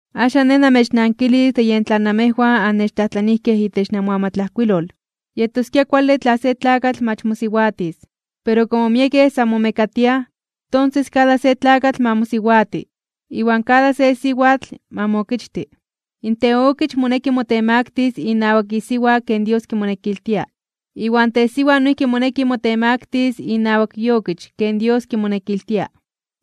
Axan nej namechnankilis de yen tlan namejwan annechtlajtlanijkej itech namoamatlajkuilol. Yetoskia kuale tla se tlakatl mach mosiwatis. Pero komo miekej san momekatiaj, tonses kada se tlakatl ma mosiwati, iwan kada se siwatl ma mookichti. In teokich moneki motemaktis (motemaktilis) inawak isiwa ken Dios kimonekiltia. Iwan tesiwa noijki moneki motemaktis inawak iokich ken Dios kimonekiltia.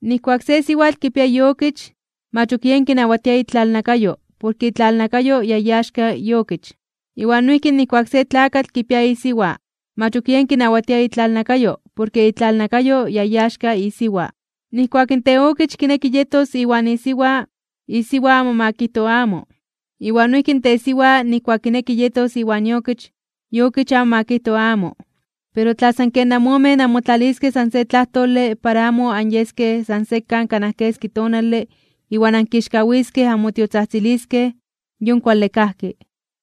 Nijkuak se siwatl kipia iokich, mach ok yen kinawatia itlalnakayo porke itlalnakayo ya iaxka iokich. Iwan noijki nijkuak se tlakatl kipia isiwa, mach ok yen kinawatia itlalnakayo porke itlalnakayo ya iaxka isiwa. Nijkuak in teokich kineki yetos iwan isiwa, isiwa amo ma kijto amo, iwan noijki in tesiwa nijkuak kineki yetos iwan iokich, iokich amo ma kijto amo. Pero tla san ken amomen anmotlaliskej san se tlajtole para amo anyeskej san sekan kanaj keski tonale iwan ankixkawiskej (onmechonmelis) anmotiotzajtziliskej, yon kuale kajki.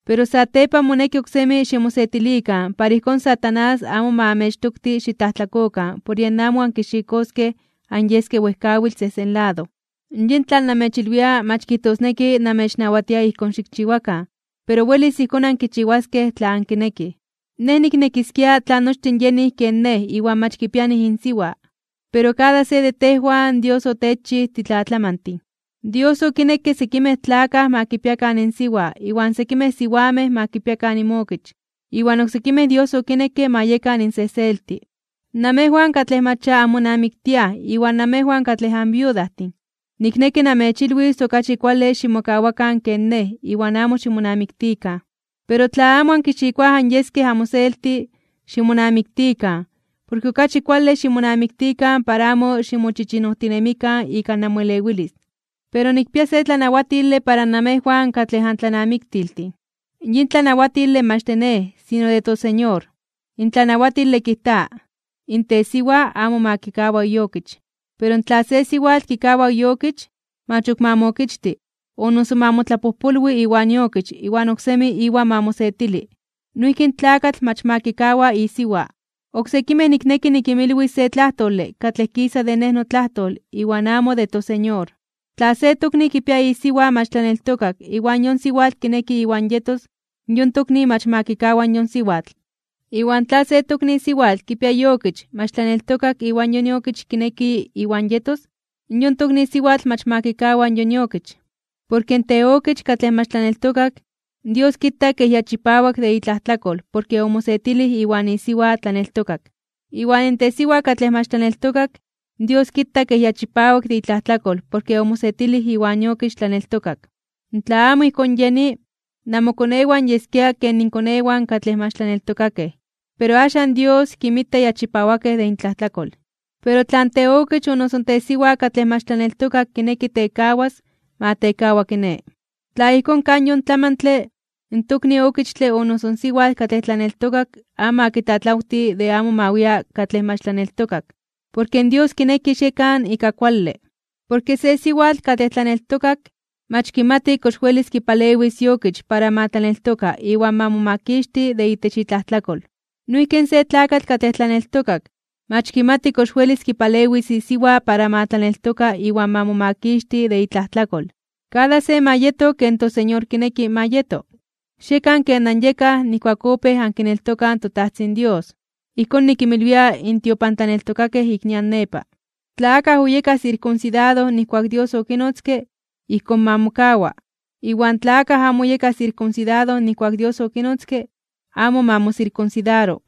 Pero satepan moneki oksemi ximosetilikan para ijkón Satanás amo amechtoktis xitlajtlakokan por yen amo ankixikoskej anyeskej wejkawitl sejsen lado. Yin tlan namechilwia mach kijtosneki namechnawatia ijkón xikchiwakan, pero welis ijkón ankichiwaskej tla ankinekij. Nej niknekiskia tla nochtin yenij ken nej iwan mach kipianij insiwa. Pero kada se de tejwan Dios otechchij titlatlamantin. Dios okinekke sekimej tlakaj ma kipiakan insiwa iwan sekimej siwamej ma kipiakan inmokich, iwan oksekimej Dios okinekke ma yekan insejselti. Namejwan katlej mach ya anmonamiktiaj iwan namejwan katlej anviudajtin, nikneki namechilwis okachi kuale ximokawakan ken nej iwan amo ximonamiktikan. Pero tla amo ankixikoaj anyeskej amoselti, ximonamiktikan, porke okachi kuale ximonamiktikan para amo ximochichinojtinemikan ika namoelewilis. Pero nikpia se tlanawatile para namejwan katlej antlanamiktiltin. Yin tlanawatile mach de nej, sino de toSeñor. In tlanawatile kijta: in tesiwa amo ma kikawa iokich. Pero tla se siwatl kikawa iokich, mach ok ma mookichti, o noso ma motlapojpolwi iwan iokich iwan oksemi iwan ma mosetili. Noijki in tlakatl mach ma kikawa isiwa. Oksekimej nikneki nikinmilwis se tlajtole katlej kisa de nej notlajtol iwan amo de toSeñor, tla se tokni kipia isiwa mach tlaneltokak iwan yon siwatl kineki iwan yetos, yon tokni mach ma kikawa yon siwatl. Iwan tla se tokni siwatl kipia iokich mach tlaneltokak iwan yon iokich kineki iwan yetos, yon tokni siwatl mach ma kikawa yon iokich. Porke in teokich katlej mach tlaneltokak, Dios kita kej ya chipawak de itlajtlakol porke omosetilij iwan isiwa tlaneltokak. Iwan tesiwa katlej mach tlaneltokak, Dios kita kej ya chipawak de itlajtlakol porke omosetilij iwan iokich tlaneltokak. Tla amo ijkón yeni, namokonewan yeskia ken inkonewan katlej mach tlaneltokakej, pero axan Dios kinmita ya chipawakej de intlajtlakol. Pero tla in teokich o noso in tesiwa katlej mach tlaneltokak kineki tekawas, ma tekawa kiné. Tla ijkón kaj yon tlamantle, in tokni okichtle o noso siwatl katlej tlaneltokak amo ma kitlatlawti de amo ma wia katlej mach tlaneltokak. Porke in Dios kineki xiekan ika kuale. Porke se siwatl katlej tlaneltokak, mach kimati kox welis kipalewis iokich para ma tlaneltoka iwan ma momakixti de itech itlajtlakol. Noijki se tlakatl katlej tlaneltokak, mach kimati kox welis kipalewis isiwa para ma tlaneltoka iwan ma momakixti de itlajtlakol. Kada se ma yeto ken toSeñor kineki ma yeto. Xiekan ken anyekaj nijkuak opéj ankineltokaj in toTajtzin Dios. Ijkón nikinmilwia in tiopantlaneltokakej ik nian nepa. Tla akaj oyeka sirkunsidado nijkuak Dios okinotzke, ijkón ma mokawa. Iwan tla akaj amo oyeka sirkunsidado nijkuak Dios okinotzke, amo ma mosirkunsidaro.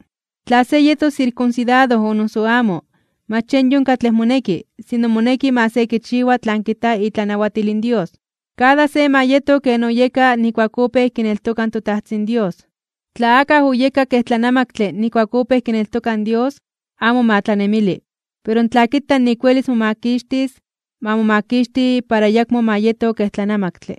Tla se yetos sirkunsidado o noso amo, mach yen yon katlej moneki, sino moneki ma se kichiwa tlan kijta itlanawatil in Dios. Kada se ma yeto ken oyeka nijkuak opéj kineltoka in toTajtzin Dios. Tla akaj oyeka kej tlanamaktle nijkuak opéj kineltoka in Dios, amo ma tlanemili. Pero tla kita nik welis momakixtis, ma momakixti para ayakmo ma yeto kej tlanamaktle.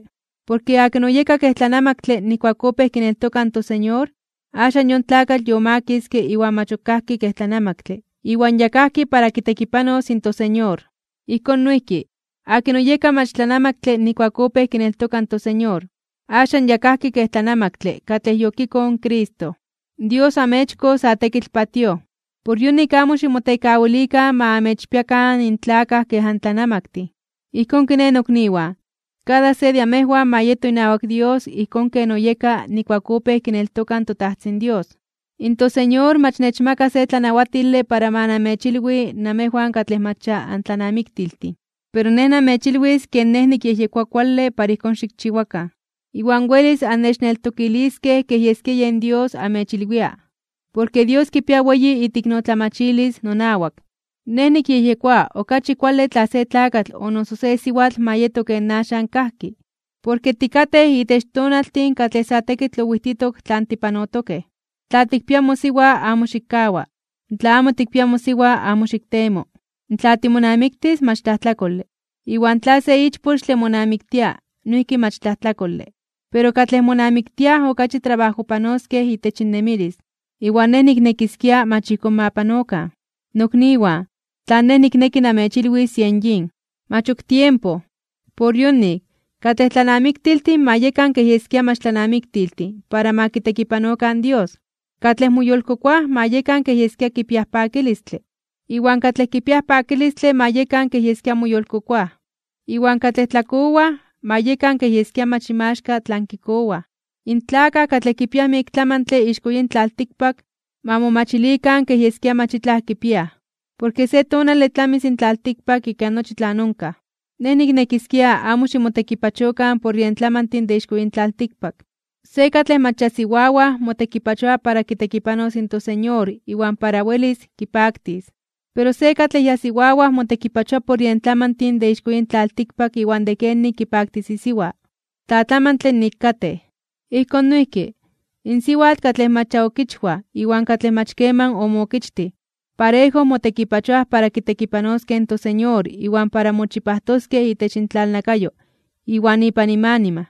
Porke akin oyeka kej tlanamaktle nijkuak opéj kineltoka in toSeñor, axan yon tlakatl yomakiske iwan mach ok kajki kej tlanamaktle iwan ya kajki para kitekipanos in toSeñor. Ijkón noijki, akin oyeka mach tlanamaktle nijkuak opéj kineltoka in toSeñor, axan ya kajki kej tlanamaktle katlej yokikoj in Cristo. Dios oamechkoj sa tekitl patíoj. Por yonik amo ximotekawilikan ma amechpiakan in tlakaj kej antlanamaktin. Ijkón kiné, nokniwan, kada se de amejwan ma yeto inawak Dios ijkón ken oyeka nijkuak opéj kineltoka in toTajtzin Dios. In toSeñor mach nechmaka se tlanawatile para ma namechilwi namejwan katlej mach ya antlanamiktiltin. Pero nej namechilwis ken nej nikyejyekoa kuale para ijkón xikchiwakan, iwan welis annechneltokiliskej kej yeskia yen Dios amechilwia, porke Dios kipia weyi iteiknotlamachilis nonawak. Nej nikyejyekoa okachi kuale tla se tlakatl o noso se siwatl ma yeto ken axan kajki, porke tikatej itech tonaltin katlej sa tekitl owijtitok tlan tipanotokej. Tla tikpia mosiwa, amo xikkawa. Tla amo tikpia mosiwa, amo xiktemo. Tla timonamiktis, mach tlajtlakole. Iwan tla se ichpochtle monamiktia, noijki mach tlajtlakole. Pero katlej monamiktiaj okachi trabajojpanoskej itech innemilis, iwan nej niknekiskia mach ijkón ma panokan. Nokniwan, tlan nej nikneki namechilwis yen yin: Mach ok tiempo. Por yonik, katlej tlanamiktiltin ma yekan kej yeskia mach tlanamiktiltin para ma kitekipanokan in Dios. Katlej moyolkokoaj ma yekan kej yeskia kipiaj pakilistle, iwan katlej kipiaj pakilistle ma yekan kej yeskia moyolkokoaj. Iwan katlej tlakowaj, ma yekan kej yeskia mach inmaxka tlan kikowaj. In tlakaj katlej kipiaj miek tlamantle ixko yin tlaltikpak, ma momachilikan kej yeskia mach itlaj kipiaj. Porke se tonale tlamis in tlaltikpak ika nochi tlan onkaj. Nej niknekiskia amo ximotekipachokan por yen tlamantin de ixko yin tlaltikpak. Se katlej mach ya siwawaj (siwayej) motekipachoa para kitekipanos in toSeñor iwan para welis kipaktis. Pero se katlej ya siwawaj motekipachoa por yen tlamantin de ixko yin tlaltikpak iwan de kenik kipaktis isiwa. Tlatlamantle nik katej. Ijkón noijki, in siwatl katlej mach ya okichwaj iwan katlej mach keman omookichtij, parejo motekipachoaj para kitekipanoskej in toSeñor iwan para moyolchipajtoskej itech intlalnakayo iwan ipan inmanima.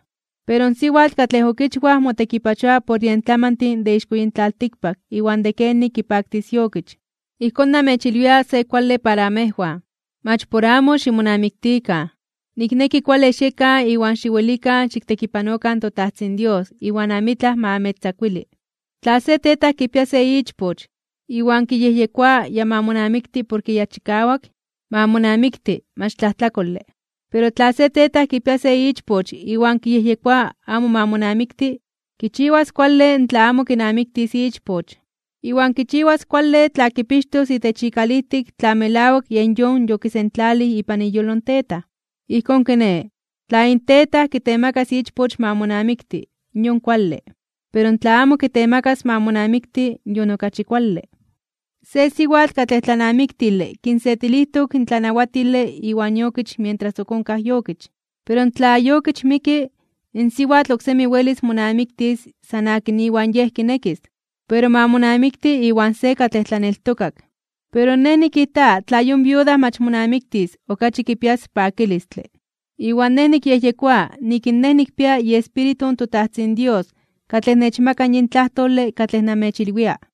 Pero in siwatl katlej okichwaj motekipachoa por yen tlamantin de ixko yin tlaltikpak iwan de kenik kipaktis iokich. Ijkón namechilwia se kuale para amejwan, mach por amo ximonamiktikan. Nikneki kuale xiekan iwan xiwelikan xiktekipanokan in toTajtzin Dios iwan amitlaj ma amechtzakuili. Tla se tetaj kipia se ichpoch, iwan kiyejyekoa ya ma monamikti porke ya chikawak, ma monamikti, mach tlajtlakole. Pero tla se tetaj kipia se ichpoch iwan kiyejyekoa amo ma monamikti, kichiwas kuale tla amo kinamiktis ichpoch, iwan kichiwas kuale tla kipixtos itech ikalijtik tla melawak yen yon yokisentlalij ipan iyolo in tetaj. Ijkón kiné, tla in tetaj kitemakas ichpoch ma monamikti, yon kuale. Pero tla amo kitemakas ma monamikti, yon okachi kuale. Se siwatl katlej tlanamiktile kinsetilijtok in tlanawatile iwan iokich mientras onkaj iokich. Pero tla iokich miki, in siwatl oksemi welis monamiktis san akin iwan yej kinekis. Pero ma monamikti iwan se katlej tlaneltokak. Pero nej nikijta tla yon viuda mach monamiktis okachi kipias pakilistle. Iwan nej nikyejyekoa nik in nej nikpia iEspíritu in toTajtzin Dios katlej nechmaka yin tlajtole katlej namechilwia.